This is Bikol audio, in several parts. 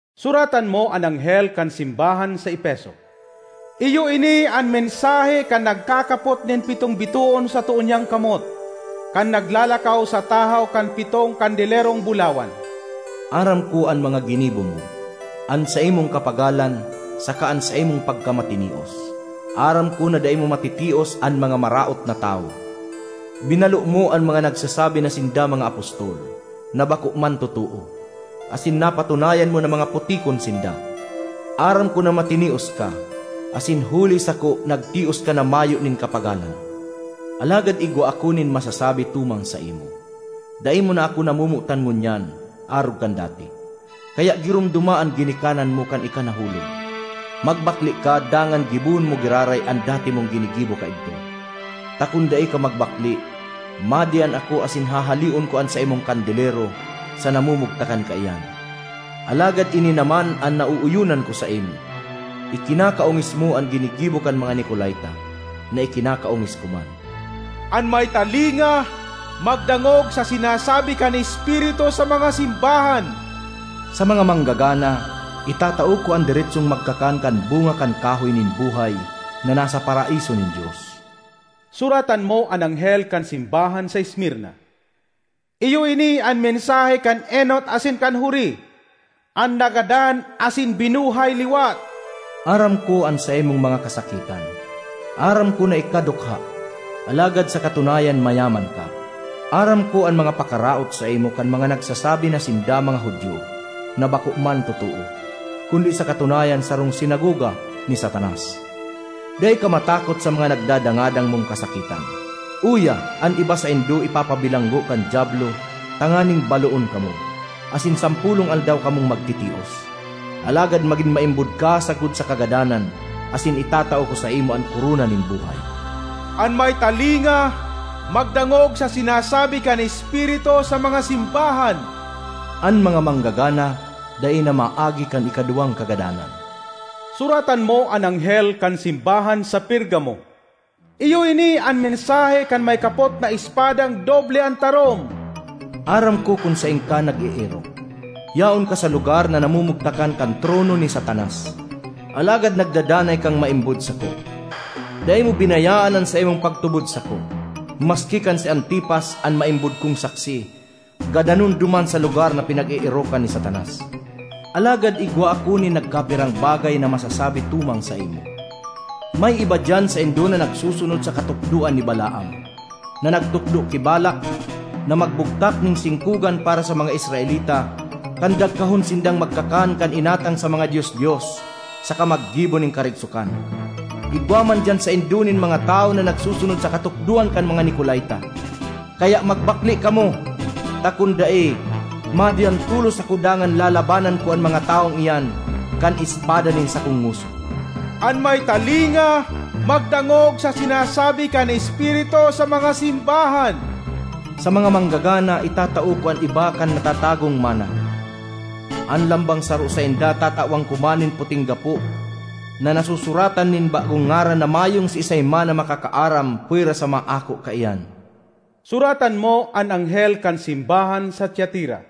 ”Suratan mo an anghel kan simbahan sa Efeso: “Iyo ini an mensahe kan nagkakapot nin pitong bitoon sa too niyang kamot, kan naglalakaw sa tahaw kan pitong kandelerong bulawan. Aram ko an mga ginibo mo, an saimong kapagalan saka an saimong pagkamatinios. Aram ko na dai mo matitios an mga maraot na tawo. Binalo mo an mga nagsasabi na sinda mga apostol, na bako man totoo, asin napatunayan mo na mga putikon sinda. Aram ko na matinios ka asin huli sako nagtios ka na mayo nin kapagalan. Alagad igwa ako nin masasabi tumang saimo: dai mo na ako namomotan ngunyan arog kan dati. Kaya giromdoma an ginikanan mo kan ika nahulog! Magbakle ka dangan gibohon mo giraray an dati mong ginigibo kaidto. Ta kun dai ka magbakle, madiyan ako asin hahaleon ko an saimong kandelero sa namumugtakan kaiyan. Alagad ini naman an naooyonan ko saimo: ikinakaongis mo an ginigibo kan mga Nicolaita, na ikinakaongis ko man. ”An may talinga, magdangog sa sinasabi kan Espiritu sa mga simbahan! “Sa mga manggagana, itatao ko an deretsong magkakan kan bunga kan kahoy nin buhay na nasa Paraiso nin Dios. ”Suratan mo an anghel kan simbahan sa Esmirna: “Iyo ini an mensahe kan enot asin kan huri, an nagadan asin binuhay liwat. Aram ko an saimong mga kasakitan; aram ko na ika dukha—alagad sa katunayan mayaman ka! Aram ko an mga pakaraot saimo kan mga nagsasabi na sinda mga Judio, na bako man totoo, kundi sa katunayan sarong sinagoga ni Satanas! Dai ka matakot sa mga nagdadangadang mong kasakitan. Uya, an iba saindo ipapabilanggo kan Diablo tanganing baloon kamo, asin sampolong aldaw kamong magtitios. Alagad magin maimbod ka sagkod sa kagadanan asin itatao ko saimo an korona nin buhay. ”An may talinga, magdangog sa sinasabi kan Espiritu sa mga simbahan! “An mga manggagana dai na maagi kan ikaduwang kagadanan. ”Suratan mo an anghel kan simbahan sa Pergamo: “Iyo ini an mensahe kan may kapot na espadang doble an tarom. Aram ko kun saen ka nag-eerok; yaon ka sa lugar na namumugtakan kan trono ni Satanas. Alagad nagdadanay kang maimbod sako. Dai mo binayaan an saimong pagtubod sako, maski kan si Antipas, an maimbod kong saksi, gadanon duman sa lugar na pinag-eerokan ni Satanas. Alagad igwa ako nin nagkapirang bagay na masasabi tumang saimo: may iba diyan saindo na nagsusunod sa katukdoan ni Balaam, na nagtukdo ki Balac na magbuktak nin singkogan para sa mga Israelita kan dagkahon sindang magkakan kan inatang sa mga dios-dios saka maggibo nin karigsokan. Igwa man diyan saindo nin mga tawo na nagsusunod sa katukdoan kan mga Nicolaita. Kaya magbakle kamo! Ta kun dai, madiyan tolos ako dangan lalabanan ko an mga tawong iyan kan espada nin sakong ngoso. ”An may talinga, magdangog sa sinasabi kan Espiritu sa mga simbahan! “Sa mga manggagana itatao ko an iba kan natatagong manna. An lambang saro sainda tatawan ko man nin puting gapo na nasusuratan nin bagong ngaran na mayong siisay man na makakaaram pwera sa maako kaiyan. ”Suratan mo an anghel kan simbahan sa Tiatira: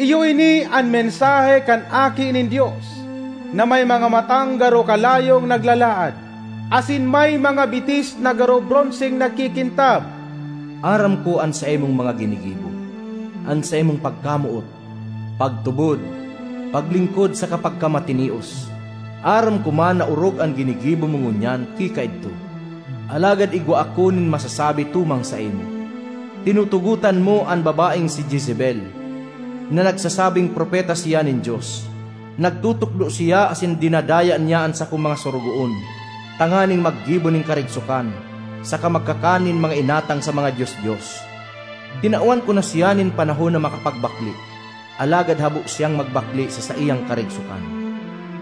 “Iyo ini an mensahe kan Aki nin Dios, na may mga matang garo kalayong naglalaad, asin may mga bitis na garo bronseng nagkikintab. Aram ko an saimong mga ginigibo, an saimong pagkamoot, pagtubod, paglingkod saka pagkamatinios. Aram ko man na orog an ginigibo mo ngunyan ki kaidto. Alagad igwa ako nin masasabi tumang saimo: tinutugotan mo an babaeng si Jezebel, na nagsasabing propeta siya nin Dios. Nagtutukdo siya asin dinadaya niya an sakong mga sorogoon tanganing maggibo nin karigsokan saka magkakan nin mga inatang sa mga dios-dios. Tinawan ko na siya nin panahon na makapagbakle, alagad habo siyang magbakle sa saiyang karigsokan.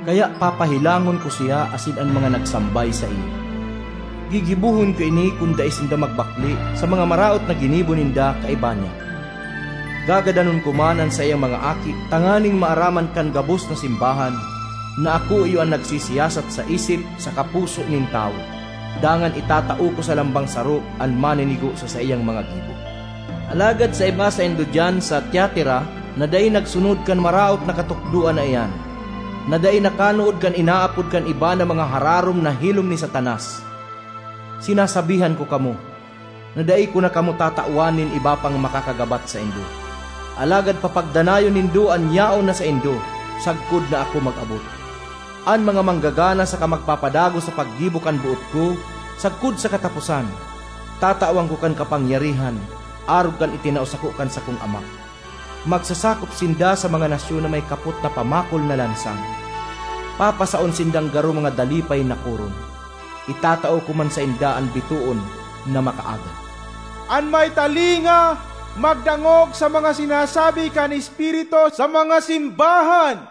Kaya papahelangon ko siya asin an mga nagsambay saiya. Gigibohon ko ini kun dai sinda magbakle sa mga maraot na ginibo ninda kaiba niya. Gagadanon ko man an saiyang mga aki tanganing maaraman kan gabos na simbahan na ako iyo an nagsisiyasat sa isip saka puso nin tawo, dangan itatao ko sa lambang saro an maninigo sa saiyang mga gibo. ”Alagad sa iba saindo diyan sa Tiatira na dai nagsunod kan maraot na katukdoan na iyan; na dai nakanood kan inaapod kan iba na mga ‘hararom na hilom ni Satanas,’ sinasabihan ko kamo na dai ko na kamo tatawan nin iba pang makakagabat saindo. Alagad papagdanayon nindo an yaon na saindo sagkod na ako mag-abot. An mga manggagana saka magpapadagos sa paggibo kan boot ko sagkod sa kataposan, tatawan ko kan kapangyarihan arog kan itinao sako kan sakong Ama: magsasakop sinda sa mga nasyon na may kapot na pamakol na lansang; papasaon sindang garo mga dalipay na koron. Itatao ko man sainda an bitoon na makaaga. ”An may talinga, magdangog sa mga sinasabi kan Espiritu sa mga simbahan!